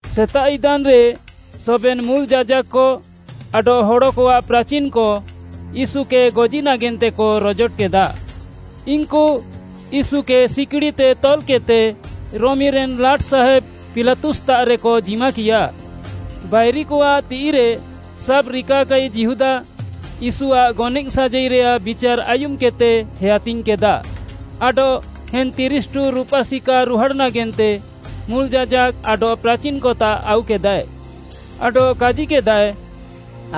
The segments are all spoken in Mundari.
ସେତାଃ ଇଦାନ୍‌ରେ ସବେନ୍‌ ମୁଲ୍‌ ଯାଜାକ୍‌କ ଆଡଃ ହଡ଼କଆଃ ପ୍ରାଚିନ୍‌କ ୟୀଶୁକେ ଗଜି ନାଗେନ୍ତେକ ରଜୋଟକେଦା। ଇନ୍‌କୁ ୟୀଶୁକେ ସିକ୍‌ଡ଼ିତେ ତଲ୍‌କେଦ୍‌ତେ ରୋମିରେନ୍‌ ଲାଟ୍‌ସାହେବ୍‌ ପିଲାତୁସ୍‌ତାଃରେକ ଜିମାକିୟା। ବାଇରିକଆଃ ତିଃଇରେ ସାବ୍‌ରିକାକାଇ ଯିହୁଦା, ୟୀଶୁଆଃ ଗନଏଃ ସାଜାଇରେୟାଃ ବିଚାର୍‌ ଆୟୁମ୍‌କେଦ୍‌ତେ ହେୟାତିଙ୍ଗ୍‌କେଦା ଆଡଃ ଏନ୍‍ ତିରିଶ୍‌ଠୁ ରୁପା ସିକା ରୁହାଡ଼୍‌ ନାଗେନ୍ତେ ମୁଲ୍‌ ଯାଜାକ୍‌ ଆଡଃ ପ୍ରାଚିନ୍‌କତାଃ ଆଉକେଦାଏ। ଆଡଃ କାଜିକେଦାଏ,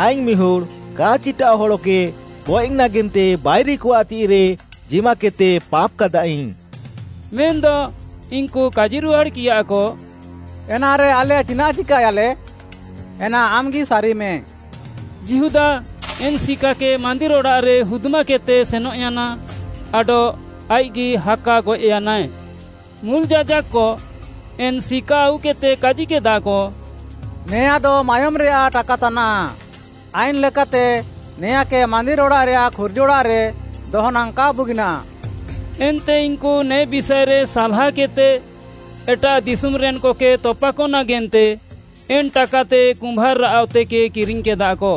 “ଆଇଙ୍ଗ୍‌ ମିହୁଡ଼୍‌ କା ଚିଟାଃଅ ହଡ଼କେ ଗଏଃ ନାଗେନ୍ତେ ବାଇରିକଆଃ ତିଃଇରେ ଜିମାକେଦ୍‌ତେ ପାପ୍‌କାଦାଇଙ୍ଗ୍‌,” ମେନ୍‌ଦ ଇନ୍‌କୁ କାଜିରୁହାଡ଼୍‌କିୟାକ, “ଏନାରେ ଆଲେ ଚିନାଃ ଚିକାୟାଲେ? ଏନା ଆମ୍‌ଗି ସାରିମେ!” ଯିହୁଦା ଏନ୍‍ ସିକାକେ ମାନ୍ଦିର୍‌ ଅଡ଼ାଃରେ ହୁଦ୍‌ମାକେଦ୍‌ତେ ସେନଃୟାନା ଆଡଃ ଆଇଃକ୍‌ଗି ହାକା ଗଏଃୟାନାଏ। ମୁଲ୍‌ ଯାଜାକ୍‌କ ଏନ୍‍ ସିକା ଆଉକେଦ୍‌ତେ କାଜିକେଦାକ, “ନେଆଁଦ ମାୟୋମ୍‌ରେୟାଃ ଟାକା ତାନାଃ, ଆଇନ୍‌ ଲେକାତେ ନେଆଁଁକେ ମାନ୍ଦିର୍‌ ଅଡ଼ାଃରେୟାଃ ଖୁର୍ଜିଅଡ଼ାଃରେ ଦହ ନାଙ୍ଗ୍‌ କା ବୁଗିନାଃ।” ଏନ୍ତେ ଇନ୍‌କୁ ନେ ବିଷାଏରେ ସାଲ୍‌ହାକେଦ୍‌ତେ, ଏଟାଃ ଦିଶୁମ୍‍ରେନ୍‌କକେ ତପାକ ନାଗେନ୍ତେ ଏନ୍‍ ଟାକାତେ କୁମ୍ଭାର୍‌ଆଃ ଅତେକେ କିରିଙ୍ଗ୍‌କେଦାକ।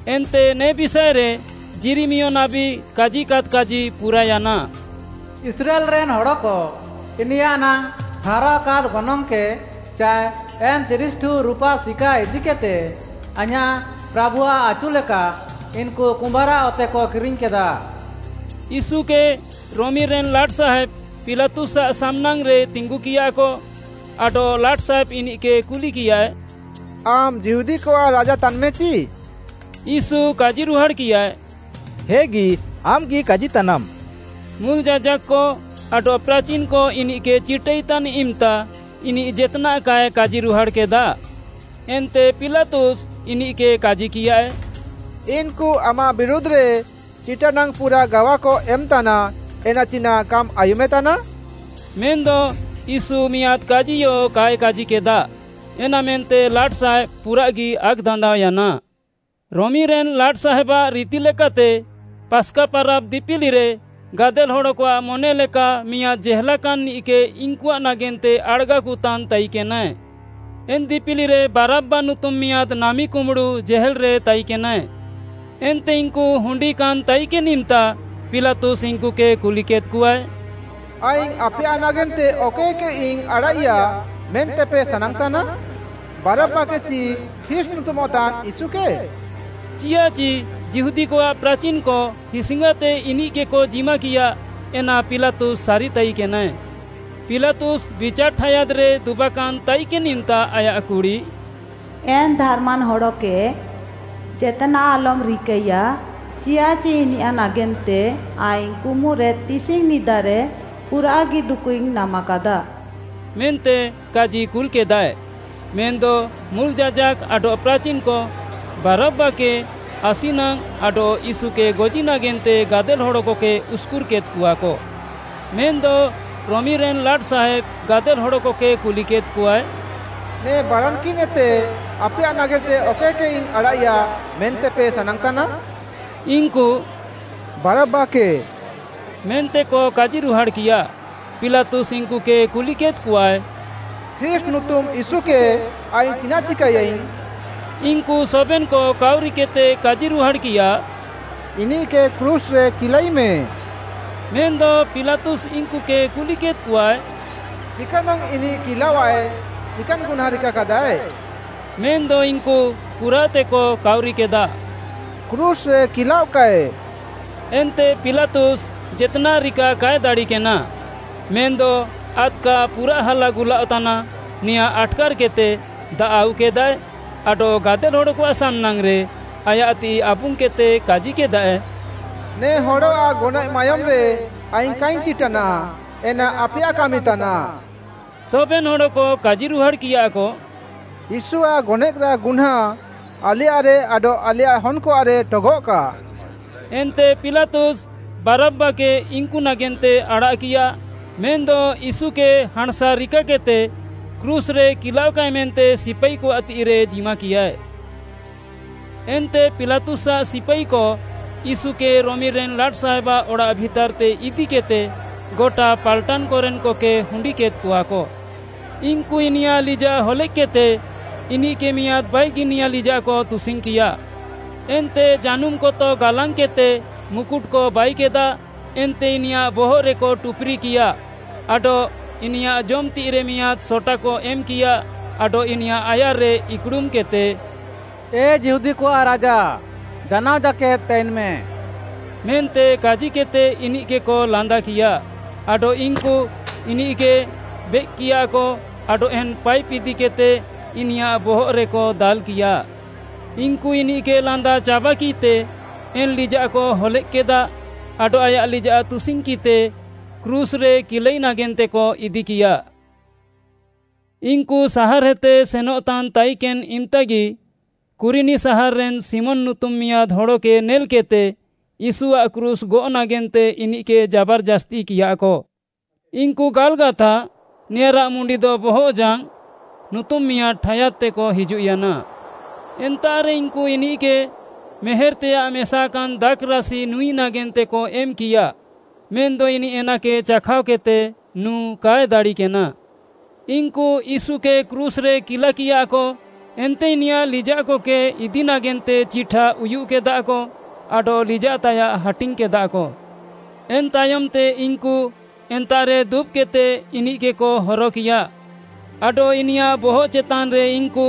ଏନ୍ତେ ନେ ବିଷାଏରେ ଯିରିମିୟ ନାବୀ କାଜିକାଦ୍‌ କାଜି ପୁରାୟାନା, “ଇସ୍ରାଏଲ୍‌ରେନ୍‌ ହଡ଼କ ଇନିୟାଃ ନାଙ୍ଗ୍‌ ଠାହାରାଅକାଦ୍‌ ଗନଙ୍ଗ୍‌କେ ଚାଏ ଏନ୍‌ ତିରିଶ୍‌ଠୁ ରୁପା ସିକା ଇଦିକେଦ୍‌ତେ, ଆଇଁୟାଃ ପ୍ରାଭୁଆଃ ଆଚୁ ଲେକା ଇନ୍‌କୁ କୁମ୍ଭାର୍‌ଆଃ ଅତେକ କିରିଙ୍ଗ୍‌କେଦା।” ୟୀଶୁକେ ରୋମିରେନ୍‌ ଲାଟ୍‌ସାହେବ୍‌ ପିଲାତୁସ୍‌ଆଃ ସାମ୍‌ନାଙ୍ଗ୍‌ରେ ତିଙ୍ଗୁକିୟାକ, ଆଡଃ ଲାଟ୍‌ସାହେବ୍‌ ଇନିଃକେ କୁଲିକିୟାଏ, “ଆମ୍‌ ଯିହୁଦୀକଆଃ ରାଜା ତାନ୍‍ମେଚି?” ୟୀଶୁ କାଜିରୁହାଡ଼୍‌କିୟାଏ, “ହେଗି, ଆମ୍‌ଗି କାଜିତାନାମ୍‌।” ମୁଲ୍‌ ଯାଜାକ୍‌କ ଆଡଃ ପ୍ରାଚିନ୍‌କ ଇନିଃକେ ଚିଟାଇତାନ୍‍ ଇମ୍‌ତା ଇନିଃ ଜେତ୍‌ନାଃ କାଏ କାଜିରୁହାଡ଼୍‌କେଦା। ଏନ୍ତେ ପିଲାତୁସ୍‌ ଇନିଃକେ କାଜିକିୟାଏ, “ଇନ୍‌କୁ ଆମାଃ ବିରୁଧ୍‌ରେ ଚିଟାନାଙ୍ଗ୍‌ ପୁରାଃ ଗାୱାକ ଏମ୍‌ତାନା ଏନା ଚିନାଃ କାମ୍‌ ଆୟୁମେତାନା?” ମେନ୍‌ଦ ୟୀଶୁ ମିଆଁଦ୍‌ କାଜିୟ କାଏ କାଜିକେଦା, ଏନାମେନ୍ତେ ଲାଟ୍‌ସାହେବ୍‌ ପୁରାଃଗି ଆକ୍‌ଦାନ୍ଦାଅୟାନା। ରୋମିରେନ୍‌ ଲାଟ୍‌ସାହେବ୍‌ଆଃ ରିତିଲେକାତେ ପାସ୍‌କା ପାରାବ୍‌ ଦିପିଲିରେ ଗାଦେଲ୍‌ ହଡ଼କଆଃ ମନେଲେକା ମିଆଁଦ୍‌ ଜେହେଲାକାନ୍‌ନିଃକେ ଇନ୍‌କୁଆଃ ନାଗେନ୍ତେ ଆଡ଼ାଗାକତାନ୍‌ ତାଇକେନାଏ। ଏନ୍‍ ଦିପିଲିରେ ବାରବ୍‌ବା ନୁତୁମ୍‌ ମିଆଁଦ୍‌ ନାମିକୁମ୍ବୁଡ଼ୁ ଜେହେଲ୍‌ରେ ତାଇକେନାଏ। ଏନ୍ତେ ଇନ୍‌କୁ ହୁଣ୍ଡିକାନ୍‌ ତାଇକେନ୍‌ ଇମ୍‌ତା ପିଲାତୁସ୍‌ ଇନ୍‌କୁକେ କୁଲିକେଦ୍‍କଆଏ, “ଆଇଙ୍ଗ୍‌ ଆପେୟାଃ ନାଗେନ୍ତେ ଅକଏକେଇଙ୍ଗ୍‌ ଆଡ଼ାଃଇୟା ମେନ୍ତେପେ ସାନାଙ୍ଗ୍‌ତାନା? ବାରବ୍‌ବାକେ ଚି ଖ୍ରୀଷ୍ଟ୍‌ ନୁତୁମଃତାନ୍‌ ୟୀଶୁକେ?” ଚିୟାଃଚି ଯିହୁଦୀକଆଃ ପ୍ରାଚିନ୍‌କ ହିସ୍‌ଙ୍ଗାତେ ଇନିଃକେକ ଜିମାକିୟା, ଏନା ପିଲାତୁସ୍‌ ସାରିତାଇକେନାଏ। ପିଲାତୁସ୍‌ ବିଚାର୍‌ ଠାୟାଦ୍‌ରେ ଦୁବାକାନ୍‌ ତାଇକେନ୍‌ ଇମ୍‌ତା ଆୟାଃ କୁଡ଼ି, “ଏନ୍‌ ଧାର୍‌ମାନ୍‌ ହଡ଼କେ ଜେତ୍‌ନାଃ ଆଲମ୍‌ ରିକାଇୟା, ଚିୟାଃଚି ଇନିୟାଃ ନାଗେନ୍ତେ ଆଇଙ୍ଗ୍‌ କୁମୁରେ ତିସିଙ୍ଗ୍‌ ନିଦାରେ ପୁରାଃଗି ଦୁକୁଇଙ୍ଗ୍‌ ନାମାକାଦା” ମେନ୍ତେ କାଜି କୁଲ୍‍କେଦାଏ। ମେନ୍‌ଦ ମୁଲ୍‌ ଯାଜାକ୍‌କ ଆଡଃ ପ୍ରାଚିନ୍‌କ ବାରବ୍‌ବାକେ ଆସି ନାଙ୍ଗ୍‌ ଆଡଃ ୟୀଶୁକେ ଗଜି ନାଗେନ୍ତେ ଗାଦେଲ୍‌ ହଡ଼କକେ ଉସ୍‍କୁର୍‍କେଦ୍‍କଆକ। ମେନ୍‌ଦ ରୋମିରେନ୍‌ ଲାଟ୍‌ସାହେବ୍‌ ଗାଦେଲ୍‌ ହଡ଼କକେ କୁଲିକେଦ୍‌କଆଏ, “ନେ ବାରାନ୍‌କିନ୍‌ଏତେ ଆପେୟାଃ ନାଗେନ୍ତେ ଅକଏକେଇଙ୍ଗ୍‌ ଆଡ଼ାଃଇୟା ମେନ୍ତେପେ ସାନାଙ୍ଗ୍‌ତାନା?” ଇନ୍‌କୁ “ବାରବ୍‌ବାକେ” ମେନ୍ତେକ କାଜିରୁହାଡ଼୍‌କିୟା। ପିଲାତୁସ୍‌ ଇନ୍‌କୁକେ କୁଲିକେଦ୍‍କଆଏ, “ଖ୍ରୀଷ୍ଟ୍‌ ନୁତୁମ୍‌ ୟୀଶୁକେ ଆଇଙ୍ଗ୍‌ ଚିନାଃ ଚିକାଇୟାଇଙ୍ଗ୍‌?” ଇନ୍‌କୁ ସବେନ୍‌କ କାଉରିକେଦ୍‌ତେ କାଜିରୁହାଡ଼୍‌କିୟା, “ଇନିଃକେ କ୍ରୁଶ୍‌ରେ କିଲାଇମେ।” ମେନ୍‌ଦ ପିଲାତୁସ୍‌ ଇନ୍‌କୁକେ କୁଲିକେଦ୍‍କଆଏ, “ଚିକାନାଙ୍ଗ୍‌ ଇନିଃ କିଲାୱାଏଃ ଚିକାନ୍‌ ଗୁହ୍ନାଁ ରିକାକାଦାଏ?” ମେନ୍‌ଦ ଇନ୍‌କୁ ପୁରାଃତେକ କାଉରିକେଦା, “କ୍ରୁଶ୍‌ରେ କିଲାଅଃକାଏ।” ଏନ୍ତେ ପିଲାତୁସ୍‌ ଜେତ୍‌ନାଃ ରିକା କାଏ ଦାଡ଼ିକେନା, ମେନ୍‌ଦ ଆଦ୍‌କା ପୁରାଃ ହାଲାଗୁଲାଅଃତାନା, ନେଆଁଁ ଆଟ୍‌କାର୍‌କେଦ୍‌ତେ ଦାଆଃ ଆଉକେଦାଏ ଆଡଃ ଗାଦେଲ୍‌ ହଡ଼କଆଃ ସାମ୍‌ନାଙ୍ଗ୍‌ରେ ଆୟାଃ ତିଃଇ ଆବୁଙ୍ଗ୍‌କେଦ୍‌ତେ କାଜିକେଦାଏ, “ନେ ହଡ଼ଆଃ ଗନଏଃ ମାୟୋମ୍‌ରେ ଆଇଙ୍ଗ୍‌ କାଇଙ୍ଗ୍‌ ଚିଟାନାଃ, ଏନା ଆପେୟାଃ କାମିତାନାଃ।” ସବେନ୍‌ ହଡ଼କ କାଜିରୁହାଡ଼୍‌କିୟାକ, “ୟୀଶୁଆଃ ଗନଏଃରାଃ ଗୁହ୍ନାଁ ଆଲେୟାଃରେ ଆଡଃ ଆଲେୟାଃ ହନ୍‍କଆଃରେ ଠଗଃକା।” ଏନ୍ତେ ପିଲାତୁସ୍‌ ବାରବ୍‌ବାକେ ଇନ୍‌କୁ ନାଗେନ୍ତେ ଆଡ଼ାଃକିୟା, ମେନ୍‌ଦ ୟୀଶୁକେ ହାଁଣ୍‌ସା ରିକାକେଦ୍‌ତେ କ୍ରୁଶ୍‌ରେ କିଲାଅଃକାଏ ମେନ୍ତେ ସିପାଇକଆଃ ତିଃଇରେ ଜିମାକିୟାଏ। ଏନ୍ତେ ପିଲାତୁସ୍‌ଆଃ ସିପାଇକ ୟୀଶୁକେ ରୋମିରେନ୍‌ ଲାଟ୍‌ସାହେବ୍‌ଆଃ ଅଡ଼ାଃ ଭିତାର୍‌ତେ ଇଦିକେଦ୍‌ତେ ଗଟା ପାଲ୍‌ଟାନ୍‍କରେନ୍‌କକେ ହୁଣ୍ଡିକେଦ୍‍କଆକ। ଇନ୍‌କୁ ଇନିୟାଃ ଲିଜାଃ ହଲେଃକ୍‌କେଦ୍‌ତେ ଇନିଃକେ ମିଆଁଦ୍‌ ବାଇଗିନିଆ ଲିଜାଃକ ତୁସିଙ୍ଗ୍‌କିୟା। ଏନ୍ତେ ଜାନୁମ୍‌ କତ ଗାଲାଙ୍ଗ୍‌କେଦ୍‍ତେ ମୁକୁଟ୍‌କ ବାଇକେଦା ଏନ୍ତେ ଇନିୟାଃ ବହଃରେକ ଟୁପୁରିକିଆ ଆଡଃ ଇନିୟାଃ ଜମ୍‌ ତିଃଇରେ ମିଆଁଦ୍‌ ସଟାକ ଏମ୍‌କିୟା ଆଡଃ ଇନିୟାଃ ଆୟାର୍‌ରେ ଇକ୍‌ଡ଼ୁମ୍‌କେଦ୍‌ତେ, “ଏ ଯିହୁଦୀକଆଃ ରାଜା ଜାନାଅ ଜାକେଦ୍‌ ତାଇନ୍‌ମେ” ମେନ୍ତେ କାଜିକେଦ୍‌ତେ ଇନିଃକେକ ଲାନ୍ଦାକିୟା। ଆଡଃ ଇନ୍‌କୁ ଇନିଃକେ ବେଏକ୍‌କିୟାକ ଆଡଃ ଏନ୍‍ ପାଇପ୍‌ ଇଦିକେଦ୍‌ତେ ଇନିୟାଃ ବହଃରେକ ଦାଲ୍‌କିୟା। ଇନ୍‌କୁ ଇନିଃକେ ଲାନ୍ଦା ଚାବାକିତେ, ଏନ୍‍ ଲିଜାଃକ ହଲେଃକ୍‌କେଦା ଆଡଃ ଆୟାଃ ଲିଜାଃ ତୁସିଙ୍ଗ୍‌କିତେ କ୍ରୁଶ୍‌ରେ କିଲାଇ ନାଗେନ୍ତେକ ଇଦିକିୟା। ଇନ୍‌କୁ ସାହାର୍‌ଏତେ ସେନଃତାନ୍‌ ତାଇକେନ୍‌ ଇମ୍‍ତାଗି ଶିମୋନ୍‌ ନୁତୁମ୍‌ କୁରିନି ସାହାର୍‌ରେନ୍‌ ମିଆଁଦ୍‌ ହଡ଼କେ ନେଲ୍‌କେଦ୍‌ତେ ୟୀଶୁଆଃ କ୍ରୁଶ୍‌ ଗଅଃ ନାଗେନ୍ତେ ଇନିଃକେ ଜାବାର୍‌ଜାସ୍ତିକିୟାକ। ଇନ୍‌କୁ ଗାଲ୍‌ଗାଥା, ନେଆଁଁରାଃ ମୁଣ୍ଡିଦ “ବହଃଜାଙ୍ଗ୍‌” ନୁତୁମ୍‌ ମିଆଁଦ୍‌ ଠାୟାଦ୍‌ତେକ ହିଜୁଃୟାନା। ଏନ୍ତାଃରେ ଇନ୍‌କୁ ଇନିଃକେ ମେହେର୍‍ତେଆଃ ମେସାକାନ୍‍ ଦାଖ୍‌ରାସି ନୁଁଇ ନାଗେନ୍ତେକ ଏମ୍‌କିୟା, ମେନ୍‌ଦ ଇନିଃ ଏନାକେ ଚାଖାଅକେଦ୍‍ତେ ନୁଁ କାଏ ଦାଡ଼ିକେନା। ଇନ୍‌କୁ ୟୀଶୁକେ କ୍ରୁଶ୍‌ରେ କିଲାକିୟାକ, ଏନ୍ତେ ଇନିୟାଃ ଲିଜାଃକକେ ଇଦି ନାଗେନ୍ତେ ଚିଠା ଉୟୁଃକେଦାକ ଆଡଃ ଲିଜାଃତାୟାଃ ହାଟିଙ୍ଗ୍‌କେଦାକ। ଏନ୍‌ ତାୟମ୍‌ତେ ଇନ୍‌କୁ ଏନ୍ତାଃରେ ଦୁବ୍‌କେଦ୍‌ତେ ଇନିଃକେକ ହରକିୟା। ଆଡଃ ଇନିୟାଃ ବହଃ ଚେତାନ୍‍ରେ ଇନ୍‌କୁ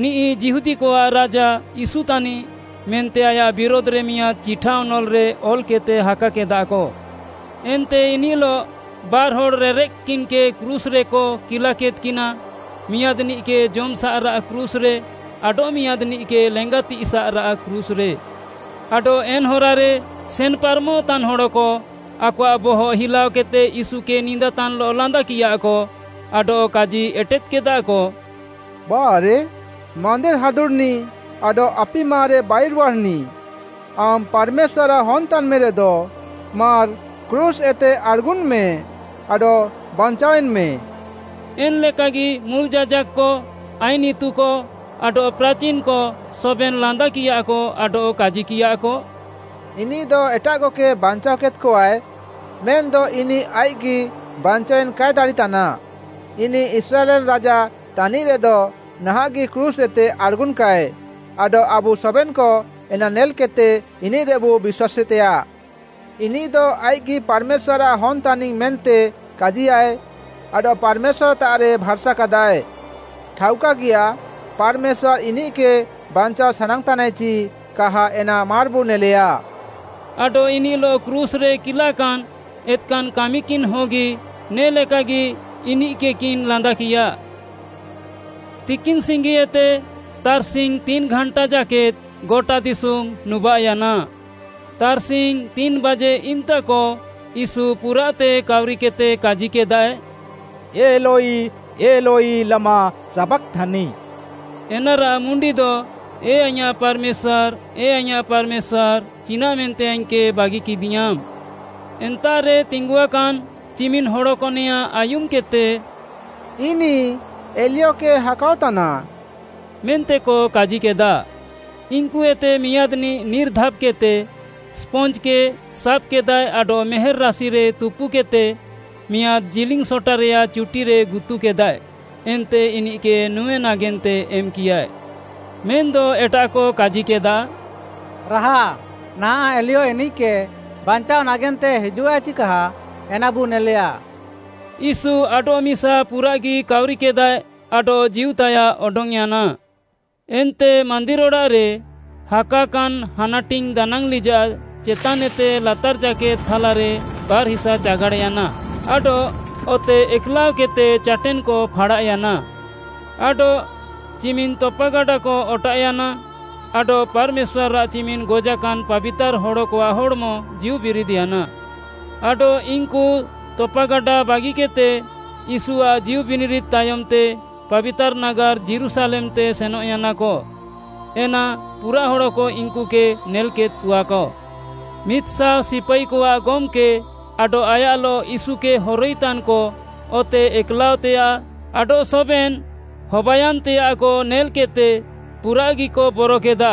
“ନିଃ ଯିହୁଦୀକଆଃ ରାଜା ୟୀଶୁ ତାନିଃ,” ମେନ୍ତେ ଆୟାଃ ବିରୁଧ୍‌ରେ ମିଆଁଦ୍‌ ଚିଠାଅନଲ୍‌ରେ ଅଲ୍‌କେଦ୍‌ତେ ହାକାକେଦାକ। ଏନ୍ତେ ଇନିଃଲଃ ବାର୍‌ହଡ଼୍‌ ରେରେଃକ୍‌କିନ୍‌କେ କ୍ରୁଶ୍‍ରେକ କିଲାକେଦ୍‍କିନା ମିଆଁଦ୍‌ନିଃକେ ଜମ୍‌ସାଃରାଃ କ୍ରୁଶ୍‌ରେ ଆଡଃମିଆଁଦ୍‌ନିଃକେ ଲେଙ୍ଗାତିସାଃରାଃ କ୍ରୁଶ୍‌ରେ। ଆଡଃ ଏନ୍‌ ହରାରେ ସେନ୍‌ପାରମଃତାନ୍‌ ହଡ଼କ ଆକଆଃ ବହଃ ହିଲାଅକେଦ୍‌ତେ ୟୀଶୁକେ ନିନ୍ଦାତାନ୍‌ଲଃ ଲାନ୍ଦାକିୟାକ, ଆଡଃ କାଜି ଏଟେଦ୍‌କେଦାକ, “ବାଃରେ, ମାନ୍ଦିର୍‌ ହାଦୁଡ଼୍‌ନିଃ ଆଡଃ ଆପିମାରେ ବାଇରୁହାଡ଼୍‌ନିଃ, ଆମ୍‌ ପାର୍‌ମେଶ୍ୱାର୍‌ଆଃ ହନ୍‌ତାନ୍‌ମେରେଦ ମାର୍‌ କ୍ରୁଶ୍‌ଏତେ ଆଡ଼୍‌ଗୁନ୍‌ମେ ଆଡଃ ବାଞ୍ଚାଅଏନ୍‌ମେ।” ଏନ୍‌ ଲେକାଗି ମୁଲ୍‌ ଯାଜାକ୍‌କ, ଆଇନ୍‌ ଇତୁକ ଆଡଃ ପ୍ରାଚିନ୍‌କ ସବେନ୍‌ ଲାନ୍ଦାକିୟାକ, ଆଡଃ କାଜିକିୟାକ, “ଇନିଃଦ ଏଟାଃକକେ ବାଞ୍ଚାଅକେଦ୍‍କଆଏ, ମେନ୍‌ଦ ଇନିଃ ଆଇଃକ୍‌ଗି ବାଞ୍ଚାୱେନ୍‌ କାଏ ଦାଡ଼ିତାନ୍‌। ଇନିଃ ଇସ୍ରାଏଲ୍‌ରେନ୍‌ ରାଜା ତାନିଃରେଦ ନାହାଁଃଗି କ୍ରୁଶ୍‌ଏତେ ଆଡ଼୍‌ଗୁନ୍‌କାଏ, ଆଡଃ ଆବୁ ସବେନ୍‌କ ଏନା ନେଲ୍‌କେଦ୍‌ତେ ଇନିଃରେବୁ ବିଶ୍ୱାସେତେୟାଃ। ଇନିଃଦ ଆଇଃକ୍‌ଗି ପାର୍‌ମେଶ୍ୱାର୍‌ଆଃ ହନ୍‌ତାନିଙ୍ଗ୍‌ ମେନ୍ତେ କାଜିୟାଃଏ ଆଡଃ ପାର୍‌ମେଶ୍ୱାର୍‌ତାଃରେ ଭାର୍‌ସାକାଦାଏ। ଠାଉକାଗିୟା, ପାର୍‌ମେଶ୍ୱାର୍‌ ଇନିଃକେ ବାଞ୍ଚାଅ ସାନାଙ୍ଗ୍‌ତାନାଏ ଚି କାହା ଏନା ମାର୍‌ବୁ ନେଲେୟା।” ଆଡଃ ଇନିଃଲଃ କ୍ରୁଶ୍‌ରେ କିଲାକାନ୍ ଏତ୍‌କାନ୍‌ କାମିକିନ୍‌ହଗି ନେ ଲେକାଗି ଇନିଃକେକିନ୍‌ ଲାନ୍ଦାକିୟା। ତିକିନ୍‍ସିଙ୍ଗିଏତେ ତାର୍‌ସିଙ୍ଗ୍‌ ତିନ୍‌ଘାଣ୍ଟା ଜାକେଦ୍‌ ଗଟା ଦିଶୁମ୍‌ ନୁବାଃୟାନା। ତାର୍‌ସିଙ୍ଗ୍‌ ତିନ୍‌ବାଜେ ଇମ୍‌ତାକ ୟୀଶୁ ପୁରାଃତେ କାଉରିକେଦ୍‌ତେ କାଜିକେଦାଏ, “ଏଲୋଇ, ଏଲୋଇ, ଲାମା ସାବାକ୍‍ଥାନି?” ଏନାରାଃ ମୁଣ୍ଡିଦ, “ଏ ଆଇଁୟାଃ ପାର୍‌ମେଶ୍ୱାର୍‌, ଏ ଆଇଁୟାଃ ପାର୍‌ମେଶ୍ୱାର୍‌ ଚିନାଃମେନ୍ତେ ଆଇଙ୍ଗ୍‌କେ ବାଗିକିଦିୟାଁମ୍?” ଏନ୍ତାଃରେ ତିଙ୍ଗୁଆକାନ୍‌ ଚିମିନ୍‌ ହଡ଼କ ନେଆଁଁ ଆୟୁମ୍‌କେଦ୍‌ତେ, “ଇନିଃ ଏଲିୟକେ ହାକାଅତାନା” ମେନ୍ତେକ କାଜିକେଦା। ଇନ୍‌କୁଏତେ ମିଆଁଦ୍‌ନିଃ ନିର୍‌ଧାବ୍‍କେଦ୍‍ତେ ସ୍ପଞ୍ଜ୍‌କେ ସାବ୍‌କେଦାଏ ଆଡଃ ମେହେର୍‌ ରାସିରେ ତୁପୁକେଦ୍‍ତେ ମିଆଁଦ୍‌ ଜିଲିଙ୍ଗ୍‌ ସଟାରେୟାଃ ଚୁଟିରେ ଗୁତୁକେଦାଏ, ଏନ୍ତେ ଇନିଃକେ ନୁଁ ନାଗେନ୍ତେ ଏମ୍‌କିୟାଏ। ମେନ୍‌ଦ ଏଟାଃକ କାଜିକେଦା, “ରାହା, ନାହାଁଃ ଏଲିୟ ଇନିଃକେ ବାଞ୍ଚାଅ ନାଗେନ୍ତେ ହିଜୁଃଆଏ ଚି କାହା ଏନାବୁ ନେଲେୟା।” ୟୀଶୁ ଆଡଃମିସା ପୁରାଃଗି କାଉରିକେଦାଏ ଆଡଃ ଜୀଉତାୟାଃ ଅଡଙ୍ଗ୍‌ୟାନା। ଏନ୍ତେ ମାନ୍ଦିର୍‌ ଅଡ଼ାଃରେ ହାକାକାନ୍‌ ହାନାଟିଙ୍ଗ୍‌ ଦାନାଙ୍ଗ୍‌ଲିଜାଃ ଚେତାନ୍‍ଏତେ ଲାତାର୍‍ ଜାକେଦ୍‌ ଥାଲାରେ ବାର୍‌ ହିସା ଚାଗାଡ଼୍‌ୟାନା ଆଡଃ ଅତେ ଏକ୍‌ଲାଅକେଦ୍‌ତେ ଚାଟେନ୍‌କ ଫାଡ଼ାଃୟାନା। ଆଡଃ ଚିମିନ୍‌ ତପାଗାଡ଼ାକ ଅଟାଃୟାନା ଆଡଃ ପାର୍‌ମେଶ୍ୱାର୍‌ଆଃ ଚିମିନ୍‌ ଗଜାକାନ୍‌ ପାବିତାର୍‌ ହଡ଼କଆଃ ହଡ଼୍‌ମ ଜୀଉବିରିଦ୍‌ୟାନା। ଆଡଃ ଇନ୍‌କୁ ତପାଗାଡ଼ା ବାଗିକେଦ୍‌ତେ ୟୀଶୁଆଃ ଜୀଉବିନିରିଦ୍‌ ତାୟମ୍‌ତେ ପାବିତାର୍‌ ନାଗାର୍‌ ଯୀରୁଶାଲେମ୍‌ତେ ସେନଃୟାନାକ। ଏନା ପୁରାଃ ହଡ଼କ ଇନ୍‌କୁକେ ନେଲ୍‌କେଦ୍‌କଆକ। ମିଦ୍‌ଶାଅ ସିପାଇକଆଃ ଗମ୍‌କେ ଆଡଃ ଆୟାଃଲଃ ୟୀଶୁକେ ହରଇତାନ୍‌କ ଅତେ ଏକ୍‌ଲାଅଃତେୟାଃ ଆଡଃ ସବେନ୍‌ ହବାୟାନ୍‍ତେୟାଃକ ନେଲ୍‍କେଦ୍‍ତେ ପୁରାଃଗିକ ବରକେଦା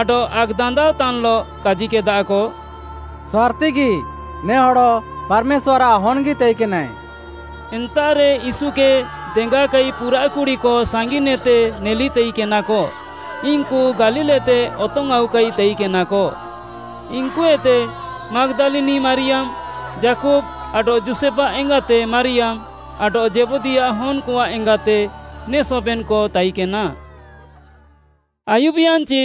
ଆଡଃ ଆକ୍‌ଦାନ୍ଦାଅଃତାନ୍‌ଲଃ କାଜିକେଦାକ, “ସାର୍‌ତିଗି ନେ ହଡ଼ ପାର୍‌ମେଶ୍ୱାର୍‌ଆଃ ହନ୍‍ଗି ତାଇକେନାଏ।” ଏନ୍ତାଃରେ ୟୀଶୁକେ ଦେଙ୍ଗାକାଇ ପୁରାଃ କୁଡ଼ିକ ସାଙ୍ଗିନ୍‍ଏତେ ନେଲି ତାଇକେନାକ। ଇନ୍‌କୁ ଗାଲିଲ୍‌ଏତେ ଅତଙ୍ଗ୍‌ଆଉକାଇ ତାଇକେନାକ। ଇନ୍‌କୁଏତେ, ମାଗ୍‌ଦାଲିନି ମାରିୟାମ୍‌, ଯାକୁବ୍‌ ଆଡଃ ଯୋଷେଫ୍‌ଆଃ ଏଙ୍ଗାତେ ମାରିୟାମ୍‌ ଆଡଃ ଜେବଦୀୟାଃ ହନ୍‌କଆଃ ଏଙ୍ଗାତେ, ନେ ସବେନ୍‌କ ତାଇକେନା। ଆୟୁବ୍‍ୟାନ୍‍ଚି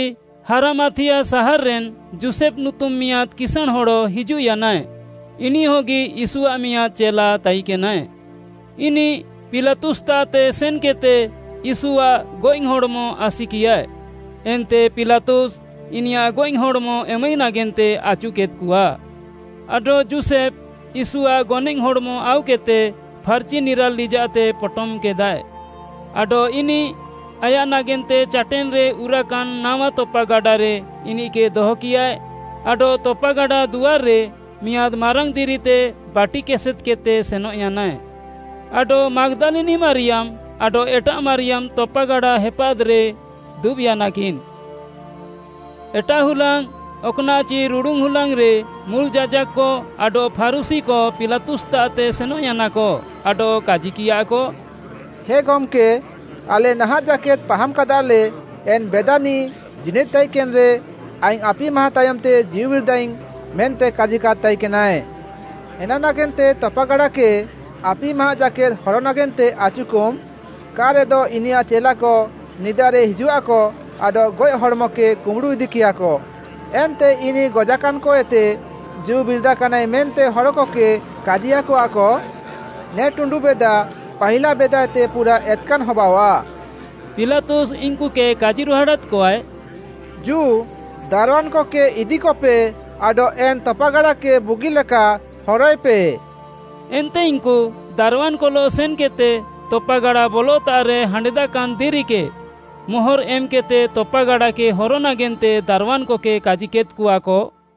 ହାରାମାଥିୟା ସାହାର୍‌ରେନ୍‌ ଯୋଷେଫ୍‌ ନୁତୁମ୍‌ ମିଆଁଦ୍‌ କିସାଁଣ୍‌ ହଡ଼ ହିଜୁଃୟାନାଏ, ଇନିଃହଗି ୟୀଶୁଆଃ ମିଆଁଦ୍‌ ଚେଲା ତାଇକେନାଏ। ଇନିଃ ପିଲାତୁସ୍‍ତାଃତେ ସେନ୍‌କେଦ୍‌ତେ ୟୀଶୁଆଃ ଗଏଃହଡ଼୍‌ମ ଆସିକିୟାଏ, ଏନ୍ତେ ପିଲାତୁସ୍‌ ଇନିୟାଃ ଗଏଃହଡ଼୍‌ମ ଏମାଇ ନାଗେନ୍ତେ ଆଚୁକେଦ୍‌କଆ। ଆଡଃ ଯୋଷେଫ୍‌ ୟୀଶୁଆଃ ଗନଏଃ ହଡ଼୍‌ମ ଆଉକେଦ୍‌ତେ ଫାର୍‌ଚି ନିରାଲ୍‌ ଲିଜାଃତେ ପଟମ୍‍କେଦାଏ। ଆଡଃ ଇନିଃ ଆୟାଃ ନାଗେନ୍ତେ ଚାଟେନ୍‌ରେ ଉରାକାନ୍‌ ନାୱା ତପାଗାଡ଼ାରେ ଇନିଃକେ ଦହକିୟାଏ ଆଡଃ ତପାଗାଡ଼ା ଦୁଆର୍‌ରେ ମିଆଁଦ୍‌ ମାରାଙ୍ଗ୍‌ ଦିରିତେ ବାଟିକେସେଦ୍‍କେଦ୍‌ତେ ସେନଃୟାନାଏ। ଆଡଃ ମାଗ୍‌ଦାଲିନି ମାରିୟାମ୍‌ ଆଡଃ ଏଟାଃ ମାରିୟାମ୍‌ ତପାଗାଡ଼ା ହେପାଦ୍‌ରେ ଦୁବ୍‌ୟାନାକିନ୍‌। ଏଟାଃ ହୁଲାଙ୍ଗ୍‌, ଅକ୍‌ନାଃଚି ରୁଡ଼ୁନ୍‌ହୁଲାଙ୍ଗ୍‌ରେ ମୁଲ୍‌ ଯାଜାକ୍‌କ ଆଡଃ ଫାରୁଶୀକ ପିଲାତୁସ୍‌ତାଃତେ ସେନଃୟାନାକ ଆଡଃ କାଜିକିୟାକ, “ହେ ଗମ୍‌କେ, ଆଲେ ନାହାଁଃ ଜାକେଦ୍‌ ପାହାମ୍‌କାଦାଲେ ଏନ୍‍ ବେଦାନିଃ ଜୀନିଦ୍‌ ତାଇକେନ୍‌ରେ ‘ଆଇଙ୍ଗ୍‌ ଆପିମା ତାୟମ୍‌ତେ ଜୀଉବିରିଦାଇଙ୍ଗ୍‌’ ମେନ୍ତେ କାଜିକାଦ୍‌ ତାଇକେନାଏ। ଏନା ନାଗେନ୍ତେ ତପାଗାଡ଼ାକେ ଆପିମା ଜାକେଦ୍‌ ହର ନାଗେନ୍ତେ ଆଚୁକମ୍‌, କା'ରେଦ ଇନିୟାଃ ଚେଲାକ ନିଦାରେ ହିଜୁଃଆକ ଆଡଃ ଗଏଃହଡ଼୍‌ମକେ କୁମ୍ବୁଡ଼ୁ ଇଦିକେୟାକ ଏନ୍ତେ ଇନିଃ ଗଜାକାନ୍‍କଏତେ ଜୀଉବିରିଦାକାନାଏ ମେନ୍ତେ ହଡ଼କକେ କାଜିୟାକଆକ। ନେ ଟୁଣ୍ଡୁବେଦା ପାହିଲା ବେଦାଏତେ ପୁରାଃ ଏତ୍‌କାନ୍‌ ହବାଅଆଃ।” ପିଲାତୁସ୍‌ ଇନ୍‌କୁକେ କାଜିରୁହାଡ଼ାଦ୍‌କଆଏ, “ଜୁ ଦାରୱାନ୍‌କକେ ଇଦିକପେ ଆଡଃ ଏନ୍‌ ତପାଗାଡ଼ାକେ ବୁଗିଲେକା ହରୟେପେ।” ଏନ୍ତେ ଇନ୍‌କୁ ଦାରୱାନ୍‌କଲଃ ସେନ୍‌କେଦ୍‌ତେ ତପାଗାଡ଼ା ବଲତାଃରେ ହାଣ୍ଡେଦାକାନ୍‌ ଦିରିକେ ମୋହର୍‌ ଏମ୍‌କେଦ୍‌ତେ ତପାଗାଡ଼ାକେ ହର ନାଗେନ୍ତେ ଦାରୱାନ୍‌କକେ କାଜିକେଦ୍‌କଆକ।